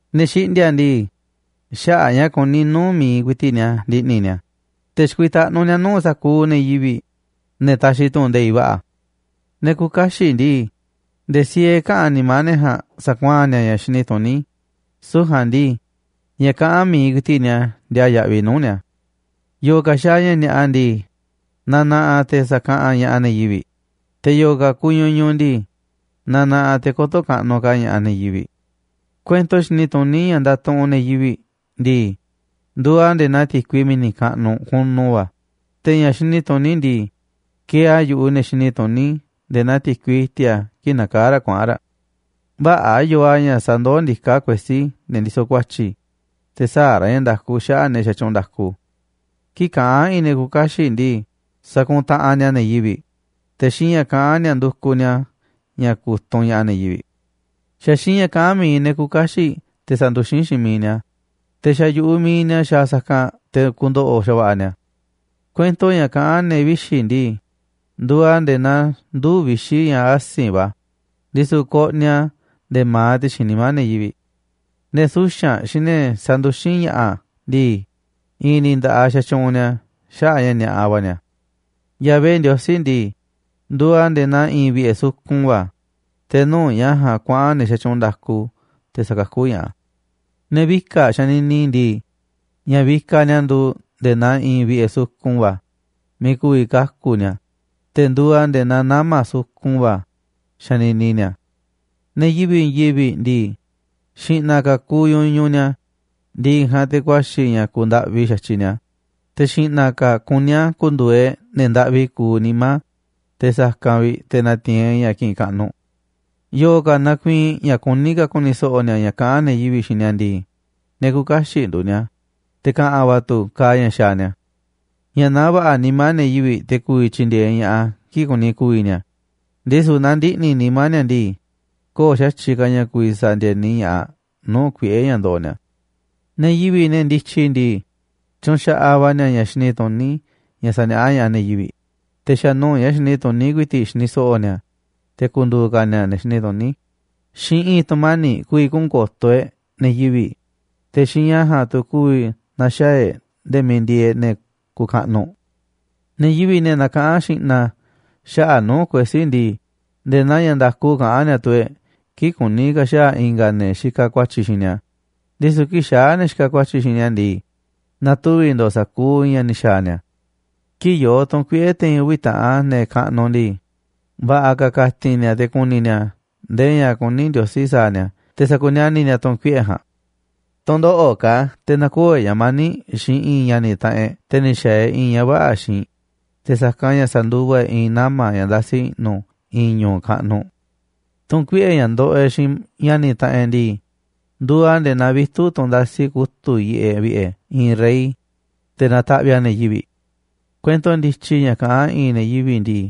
Ne̱ xiꞌndi̱a̱ꞌ ndii, xaꞌa̱ꞌ ña̱ kuní nuu̱ꞌ mi̱iꞌ ku̱i̱ti̱ꞌ ni̱a̱ ndiꞌni̱ ni̱a̱, te̱ xikuitaꞌnú ni̱a̱ nuu̱ꞌ sa̱kuuꞌ ne̱ yivi̱ꞌ, ne̱ taxiꞌ tu̱ꞌu̱n nde̱iꞌ va̱ꞌa̱. Ne̱ küuꞌ kaxiꞌ ndii, nde̱e̱ siee käꞌán nimá ne̱ ja̱a̱nꞌ sa̱kuaa̱n ni̱a̱ ña̱ xini tuní, süu̱ꞌ ja̱a̱nꞌ ndii, ña̱ kaꞌán mi̱iꞌ ku̱i̱ti̱ꞌ ni̱a̱ ndiaa yaꞌviꞌ nuu̱ꞌ ni̱a̱. Yo̱o̱ ka̱ xaaꞌ ña̱ ni̱a̱ꞌa ndii, nanaꞌaꞌ te̱ sa̱kaꞌanꞌ ña̱ꞌaꞌ ne̱ yivi̱ꞌ, te̱ yo̱o̱ ka̱ kuuꞌ ñuñuꞌ ndii, nanaꞌaꞌ te̱ kö̱to̱ kaꞌnuꞌ ka̱ ña̱ꞌaꞌ ne̱ yivi̱ꞌ. Kuento xini tuní ña̱ ndatuꞌunꞌ ne̱ yivi̱ꞌ ndii, nduuꞌ a̱ nde̱e̱ naa ti̱kui mi̱ni̱ kaꞌnuꞌ kunu va̱, te̱ ña̱ xini tuní ndii, kieeꞌ a̱ yu̱ꞌuꞌ ne̱ xini tuní nde̱e̱ naa ti̱kui i̱ti̱a̱ kii̱ꞌ nakaá raꞌ kuaꞌa̱n raꞌ. Vä̱ꞌa̱ yoo a̱ ña̱ sandoó ndiká kuesí ne̱ ndisoꞌ ku̱a̱tyi̱, te̱ sä̱a̱ ra̱ ña̱ nda̱ku xaꞌa̱ꞌ ne̱ xatyuunꞌ nda̱ku. Kii̱ꞌ kaꞌán i̱i̱n ne̱ küuꞌ kaxiꞌ ndii, sakuntaꞌanꞌ ni̱a̱ ne̱ yivi̱ꞌ, te̱ xiinꞌ ña̱ kaꞌán ni̱a̱ ndukuꞌ ni̱a̱ ña̱ ku̱tunꞌ ña̱ꞌaꞌ ne̱ yivi̱ꞌ. Xa̱ xiinꞌ ña̱ kaꞌán mi̱iꞌ ne̱ küuꞌ kaxiꞌ te̱ sanduxín xiinꞌ miiꞌ ni̱a̱, te̱ xa̱ yu̱ꞌuꞌ miiꞌ ni̱a̱ xaaꞌ sa̱kanꞌ te̱ ku̱ndo̱ꞌo̱ xa̱va̱ꞌa̱ ni̱a̱. Kuento ña̱ kaꞌán ne̱ vixi̱ ndii, nduuꞌ a̱ nde̱e̱ naa nduu̱ꞌ vixi̱ ña̱ asi̱nꞌ va̱, ndisu̱ koꞌniꞌ a̱ nde̱e̱ ma̱aꞌ ti̱xi̱n nimá ne̱ yivi̱ꞌ. Ne̱ suxa̱nꞌ xiinꞌ ne̱ sanduxín ña̱ꞌa̱ ndii, i̱i̱n ni̱ nda̱ꞌaꞌ xatyuunꞌ ni̱a̱ xaꞌa̱ꞌ a̱ ña̱ ni̱a̱ꞌa va̱ ni̱a̱. Yahvé Ndiosí ndii, nduuꞌ a̱ nde̱e̱ naa i̱i̱n vi̱ꞌe̱ sukun va̱, te̱ nuu̱ꞌ ña̱ ja̱a̱nꞌ kuaꞌa̱n ne̱ xatyuunꞌ nda̱ku te̱ sakakú ña̱ꞌaꞌ a̱. Ne̱ vika̱ꞌ xanini ndii, ña̱ vikaꞌ ni̱a̱ nduuꞌ nde̱e̱ naa i̱i̱n vi̱ꞌe̱ sukun va̱ miiꞌ ku̱vi̱ kaku̱ ni̱a̱, te̱ nduuꞌ a̱ nde̱e̱ naa nama̱ sukun va̱ xanini ni̱a̱. Ne̱ yivi̱ꞌ i̱i̱n yivi̱ꞌ ndii, xi̱ꞌna̱ ka̱ kuuꞌ ñuñuꞌ ni̱a̱, ndi̱ꞌi̱ ja̱a̱nꞌ te̱ ku̱a̱xi̱ ña̱ ku̱u̱ ndaꞌvi xa̱tyiꞌ ni̱a̱, te̱ xi̱ꞌna̱ ka̱ kuní a̱ ku̱ndu̱u̱ e̱ꞌ ne̱ ndaꞌvi kuuꞌ nimá te̱ sa̱kanꞌ vi̱ꞌ te̱ na̱ti̱i̱n e̱ꞌ ña̱ kiꞌinꞌ kaꞌnuꞌ. Yo̱o̱ ka̱ nakuiinꞌ ña̱ kuní ka̱ ku̱ni̱ so̱ꞌo̱ ni̱a̱ ña̱ kaꞌa̱n ne̱ yivi̱ꞌ xiinꞌ ni̱a̱ ndii, ne̱ küuꞌ kaxiꞌ nduuꞌ ni̱a̱, te̱ ka̱ꞌa̱n va̱ tu̱ kaaꞌ ña̱ xaaꞌ ni̱a̱. Ña̱ naá va̱ꞌa̱ nimá ne̱ yivi̱ꞌ te̱ ku̱vi̱ tyindieeꞌ ña̱ꞌaꞌ a̱ kii̱ꞌ kuni ku̱vi̱ ni̱a̱, ndisu̱ naaꞌ ndiꞌni̱ nimá ni̱a̱ ndii, köo̱ꞌ xa̱tyiꞌ ka̱ ña̱ ku̱vi̱ sa̱ndi̱e̱ni ña̱ꞌaꞌ nuu̱ꞌ kuiꞌe̱ ña̱ ndoꞌoꞌ ni̱a̱. Ne̱ yivi̱ꞌ, ne̱ ndityi ndii, tyunxaꞌaꞌ va̱ ni̱a̱ ña̱ xini tuní ña̱ saniaꞌá ña̱ꞌaꞌ ne̱ yivi̱ꞌ, te̱ xa̱ nuu̱ꞌ ña̱ xini tuní ku̱i̱ti̱ꞌ xini so̱ꞌo̱ ni̱a̱, te̱ ku̱ndu̱u̱ ka̱ ni̱a̱ ne̱ xini tuní. Xiinꞌ i̱i̱n tu̱mani̱ꞌ ku̱vi̱ kuꞌu̱n ko̱to̱ e̱ꞌ ne̱ yivi̱ꞌ, te̱ xiinꞌ ña̱ ja̱a̱nꞌ tu̱ ku̱vi̱ na̱xaa̱ e̱ꞌ nde̱e̱ miiꞌ ndieeꞌ ne̱ kuuꞌ kaꞌnuꞌ. Ne̱ yivi̱ꞌ, ne̱ nakaꞌán xi̱ꞌna̱ xaꞌa̱ꞌ nuu̱ꞌ kuesí ndii, nde̱e̱ naa ña̱ nda̱ku kaꞌán ni̱a̱ tuu e̱ꞌ kii̱ꞌ kuní ka̱ xaa̱ i̱nga̱ ne̱ xikaꞌ ku̱a̱tyi̱ xiinꞌ ni̱a̱, ndisu̱ kii̱ꞌ xaa̱ ne̱ xikaꞌ ku̱a̱tyi̱ xiinꞌ ni̱a̱ ndii, na̱tuvi̱ ndo̱o̱ sa̱kuuꞌ ña̱ ni̱ xa̱a̱ ni̱a̱. Kii̱ꞌ yoo tu̱n kuiꞌe̱ te̱i̱n uvi̱ taꞌan ne̱ kaꞌnuꞌ ndii, va̱ꞌa̱ ka̱ ka̱ti̱n ni̱a̱ te̱ ku̱ni̱ ni̱a̱ nde̱e̱ ña̱ kuní Ndiosí sa̱a̱ ni̱a̱ te̱ sa̱kuniani̱ ni̱a̱ tu̱n kuiꞌe̱ ja̱a̱nꞌ. Tu̱ndoꞌo̱ꞌ ka̱ te̱ na̱koo̱ e̱ꞌ ña̱ mani̱ꞌ xiinꞌ i̱i̱n ña̱ni̱ taꞌanꞌ e̱ꞌ te̱ ni̱ xa̱a̱ e̱ꞌ i̱i̱n ña̱ vä̱ꞌa̱ xiinꞌ, te̱ sa̱kanꞌ ña̱ sa̱nduva e̱ꞌ i̱i̱n nama̱ ña̱ ndasi i̱ꞌnu̱ i̱i̱n ñu̱u̱ kaꞌnuꞌ. Tu̱n kuiꞌe̱ ña̱ ndoꞌoꞌ e̱ꞌ xiinꞌ ña̱ni̱ taꞌanꞌ e̱ꞌ ndii, nduuꞌ a̱ nde̱e̱ naa vitu̱ꞌ tunꞌ ndasi kutu̱ꞌ yiꞌeꞌ vi̱ꞌe̱ i̱i̱n rey, te̱ nataꞌviꞌ a̱ ne̱ yivi̱ꞌ. Kuento ndityi ña̱ kaꞌán i̱ꞌi̱n ne̱ yivi̱ꞌ ndii,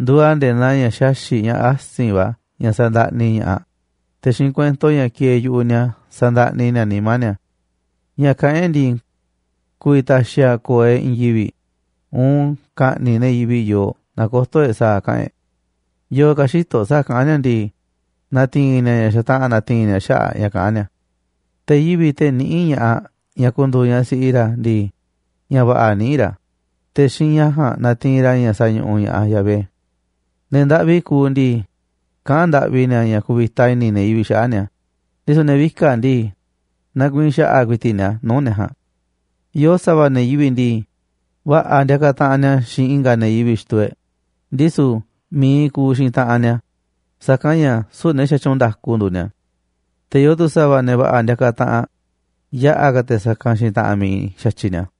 nduuꞌ a̱ nde̱e̱ naa ña̱ xaxi̱ꞌ ña̱ asi̱nꞌ va̱ ña̱ sandaꞌni ña̱ꞌaꞌ, te̱ xiinꞌ kuento ña̱ kieeꞌ yu̱ꞌuꞌ ni̱a̱ sa̱ndaꞌni ni̱a̱ nimá ni̱a̱. Ña̱ kaꞌán e̱ꞌ ndii, ku̱vi̱ ta̱xi̱ a̱ ko̱o̱ e̱ꞌ i̱i̱n yivi̱ꞌ uun ka̱ꞌni̱ꞌ ne̱ yivi̱ꞌ yooꞌ naaꞌ kö̱to̱ e̱ꞌ sa̱a̱ kaꞌa̱n e̱ꞌ. Yo̱o̱ ka̱ xïtoꞌ sa̱a̱ kaꞌán ni̱a̱ ndii, na̱ti̱i̱n ni̱a̱ ña̱ xataꞌa̱n na̱ti̱i̱n ni̱a̱ xaꞌa̱ꞌ ña̱ kaꞌán ni̱a̱. Te̱ yivi̱ꞌ, te̱ niꞌíꞌ ña̱ꞌaꞌ ñaꞌ ku̱ndu̱u̱ ñaꞌ siꞌi ra̱ ndii, ña̱ va̱ꞌa̱ niꞌíꞌ ra̱, te̱ xiinꞌ ña̱ ja̱a̱nꞌ natiinꞌ ra̱ ña̱ sañuꞌuꞌ ña̱ꞌaꞌ Yahvé. Ne̱ ndaꞌvi kuuꞌ ndii, kaꞌán ndaꞌvi ni̱a̱ ña̱ ku̱vi̱ta i̱ni̱ ne̱ yivi̱ꞌ xaꞌa̱ꞌ ni̱a̱, ndisu̱ ne̱ vika̱ꞌ ndii, nakuiinꞌ xa̱ꞌa̱ ku̱i̱ti̱ꞌ ni̱a̱ nuu̱ꞌ ne̱ ja̱a̱nꞌ. Yoo sa̱va̱ ne̱ yivi̱ꞌ ndii, va̱ꞌa̱ ndiakaꞌ taꞌanꞌ ni̱a̱ xiinꞌ i̱nga̱ ne̱ yivi̱ꞌ xituu e̱ꞌ, ndisu̱ mi̱iꞌ kuuꞌ xiinꞌ taꞌanꞌ ni̱a̱, sa̱kanꞌ ña̱ süu̱ꞌ ne̱ xatyuunꞌ nda̱ku nduuꞌ ni̱a̱. Te̱ yoo tu̱ sa̱va̱ ne̱ va̱ꞌa̱ ndiakaꞌ taꞌanꞌ yaꞌa̱ ka̱ te̱ sa̱kanꞌ xiinꞌ taꞌanꞌ mi̱iꞌ xa̱tyiꞌ ni̱a̱.